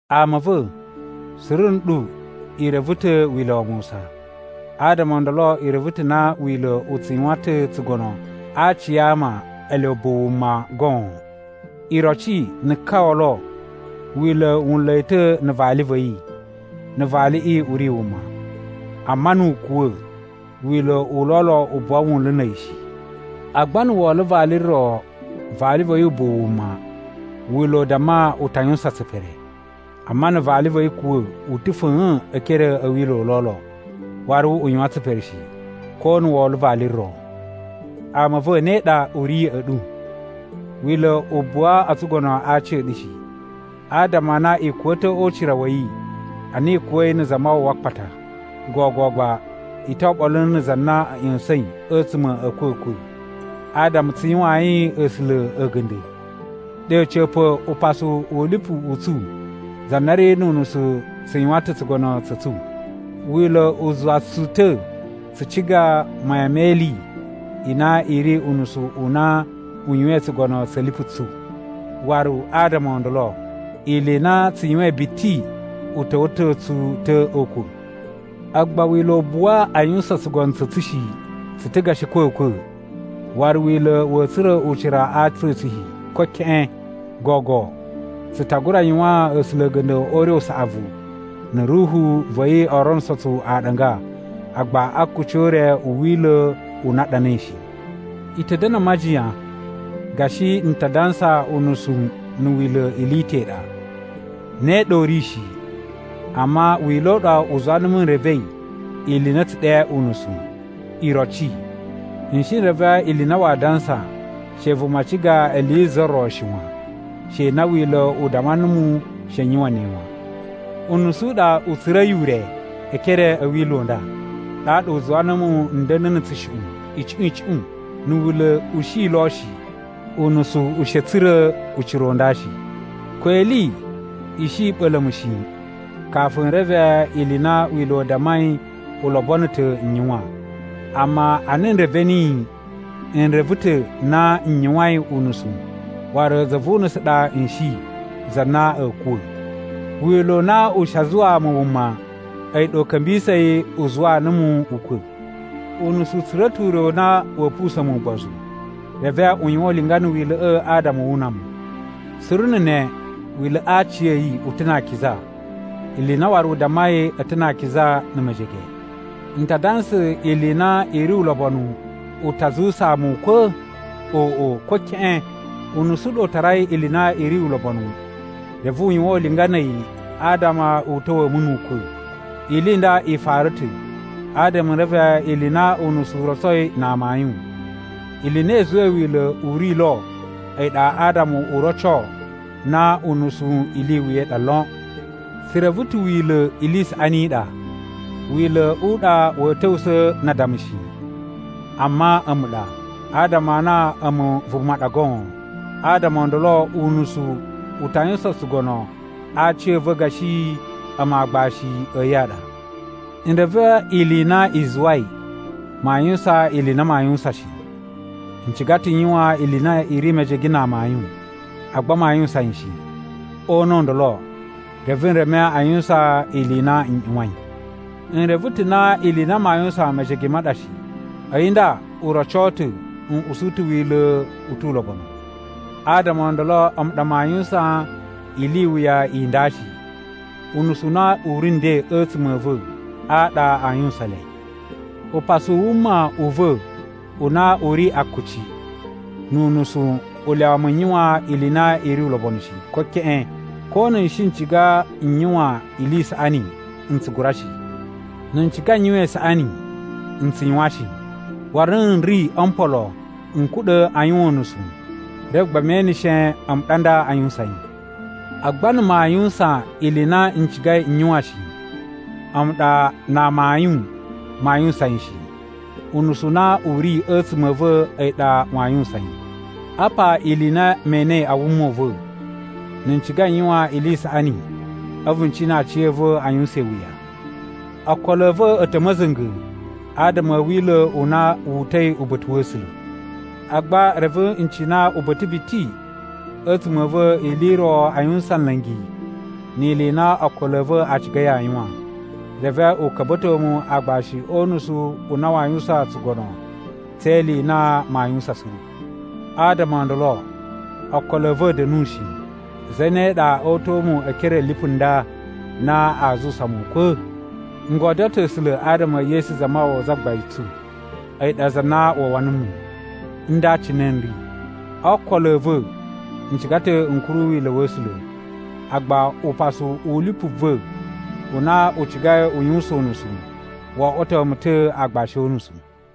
Ama a̱ va̱, suru nɗu i reve ta̱ Wila̱ wa Musa. Adama o ndolo i reve ta̱ na Wila̱ u tsu yuwan ta̱ tsugono a aci a ama ele ubuwu wuma goon. Iroci, na̱ ka olo, wila̱ wu nla̱ yi ta̱ na̱ vali va̱ yi, na̱ valiꞌi u ri wuma. Amma nu u kuwa̱, wila̱ u lolo u buwa wunlu na̱ a̱yi shi. Agba na̱ wo olo vali ro vali va̱ yi ubuwu wuma, Wila̱ u damma u ta yuwusan tsipere. Amma na̱ vali va̱ yi kuwa̱ u ta̱ fa̱a̱n e ekere a̱ wila̱ u lolo, waru u yuwan tsipere shi, ko na̱ wo olo vali ro. Ama a̱ va̱, ne ɗa u ri ya̱ꞌa̱ ɗu. Wila̱ u buwa o tsugono a aci a̱ ɗu shi, adama a na i kuwa̱ ta̱ o ucira wa̱ yi ana i kuwa̱i na̱ Zamawawa a akpata. Gogo gba i to oɓolo na̱ za na a̱ ꞌya̱sa̱in a̱tsuma̱ a̱ a̱kwa̱kwa̱, adama tsu yuwayin A̱sula̱ a̱ga̱nda̱. Ɗe a̱ca̱pa̱, upasu u lipu u tsu za na ri nu unusu tsu yuwan ta̱ tsugono tsa̱ tsu. Wila̱ u zuwa tsu ta̱ tsu ciga mayan me ili i na i ri unusu u na u yuwain tsugono tsa̱ lipu tsu. Waru adama o ndolo, ili i na tsu yuwain biti u ta̱wa̱to tsu ta̱ o ukwa̱. Agba Wila̱ u buwa a yuwusan tsugono tsa̱ tsu shi. Tsu ta̱ gashi a̱kwa̱kwa̱, waru Wila̱ wa̱a̱ tsura̱ ucira a aci a̱ tsu shi, ko keꞌen. Gogo tsu ta gura yuwaan A̱sula̱ a̱ga̱nda̱ o ure u saꞌavu na̱ Ruhu va̱ yi o ronuso tsu aɗanga, agba a akuci o ure u Wila̱ u na a ɗanai shi. I ta̱ da̱na̱ a majiyan gashi n ta dansa unusu na̱ Wila̱ ili i ta̱ i ɗa. Ne ɗa u ri shi! Amma Wila̱ u ɗa u zuwa numu n revei ili i na a̱ tsu ɗe unusu. Iroci, n shi n reve ili i na waa dansa she vuma ciga ili yi za ro shi wan, she na Wila̱ u damma numu she n yuwan ne wan. Unusu u ɗa u tsura̱i ure e ekere a̱ wila̱ u nda, ɗaɗa u zuwa numu n da̱na̱ na̱ tsushuꞌun icuꞌun icuꞌun. Na̱ Wila̱ u shi lo shi, unusu u shi a̱ tsura̱ ucira u nda shi. Ko ili i shi i ɓa̱la̱ mu shi kafu n reve ili i na Wila̱ u dammai u lobono ta̱ n yuwan. Amma ana n reve niyi, n reve ta̱ na n yuwain unusu waru za vu unusu ɗa n shi, za na a̱a̱ kuwa̱. Wila̱ u na u shi a zuwaa mu wuma, a̱yi ɗa u ka̱mbisa̱i, u zuwaa numu ukwa̱. Unusu u tsura̱ ta̱ ure u na wa̱a̱ pusa̱n mu ugbozu, reve u yuwan ulinga na̱ Wila̱ꞌa̱ adama wu una mu. Suru na̱ ne, Wila̱ꞌa̱ a aciya̱yi u ta̱ na akiza, ili i na waru u dammai a̱ ta̱ na akiza na̱ mejege. N ta dansa ili i na i ri ulobonu u ta zuwusaa mu ukwa̱? Oꞌo, ko keꞌen! Unusu u ɗa u tarai ili i na i ri ulobonu reve u yuwan ulinga na̱ a̱yi adama u ta̱wa̱a̱ mu nu ukwa̱. Ili i nda i fara ta̱ adama n reve ili i na unusu u rotsoi na amayun. Ili i na i zuwai Wila̱ u ri lo a̱yi ɗa adama u roco na unusu ili i wuya i ɗa lon. Tsu reve ta̱ Wila̱ ili i saꞌani i ɗa. Wila̱ u ɗa wa̱a̱ ta̱wusa̱a̱ na addama shi, amma a̱mu ɗa, adama a na a̱mu vuma ɗa goon. Adama o ndolo, unusu u ta yuwusan tsugono a aci a̱ va̱ gashi a̱mu aagbashi a̱ yi a ɗa. N reve ili i na i zuwai maa yuwusan ili i na maa yuwusan shi. N ciga ta̱ n yuwan ili i na i ri mejege na amayun, agba maa yuwusan yi shi. O una̱ u ndolo, reve n reme a yuwusan ili i na n ꞌyuwain. N reve ta̱ na ili i na maa yuwusan mejege ma ɗa shi, a̱yi nda u roco ta̱ n usu ta̱ Wila̱ u tu ulobonu. Adama o ndolo a̱mu ɗa maa yuwusan ili i wuya i nda shi. Unusu u na u ri nden a̱tsuma̱ a̱ va̱ a ɗa a yuwusan le. Upasu u wuma u va̱ u na u ri akuci nu unusu u lyawa mu n yuwan ili i na i ri ulobonu shi, ko keꞌen. Ko na̱ n shi n ciga n yuwan ili i saꞌani, n tsu gura shi. Na̱ n ciga n yuwan isaꞌani, n tsu yuwan shi. Waru na̱ n ri o mpolo n kuɗa̱ a yuwan unusu, reve gba me eneshe a̱mu ɗa nda a yuwusan yi. Agba na̱ maa yuwusan ili i na n cigai n yuwan shi, a̱mu ɗa na amayun maa yuwusan yi shi. Unusu u na u ri a̱tsuma̱ a̱ va̱ a̱yi ɗa waa yuwusan yi. Apa ili i na me enei a wuma u va̱, na̱ n ciga n yuwan ili i saꞌani a̱vu n cina aciya̱va̱ a yuwusan iwuya. Okolo a̱ va̱ a̱ ta̱ ma̱za̱nga̱ adama a̱ wila̱ u na wu uta̱i uba̱ta̱ wa̱ A̱sula̱. Agba reve n cina uba̱ta̱ biti a̱tsuma̱ a̱ va̱ ili i ro a yuwusan nla̱ngi ni ili i na okolo a̱ va̱ a cigai a yuwan, reve u ka̱mba̱to mu aagbashi o unusu u na waa yuwusan tsugono tse ili i na maa yuwusan suru. Adama o ndolo, okolo a̱ va̱ a̱ da̱nu shi! Zane ɗa o uta̱a̱ mu e ekere a̱ lipu nda na aa zuwusa mu ukwa̱? N godyo ta̱ A̱sula̱ adama e Yesu Zamawawa Zagbain tsu, a̱yi ɗa za na wawa numu. Nda cine n ri: o okolo a̱ va̱, n ciga ta̱ n kuru wila̱ wa̱ A̱sula̱, agba upasu u lipu va̱ u na u cigai u yuwusan unusu, wo oꞌwoto mu ta̱ aagbashi o unusu.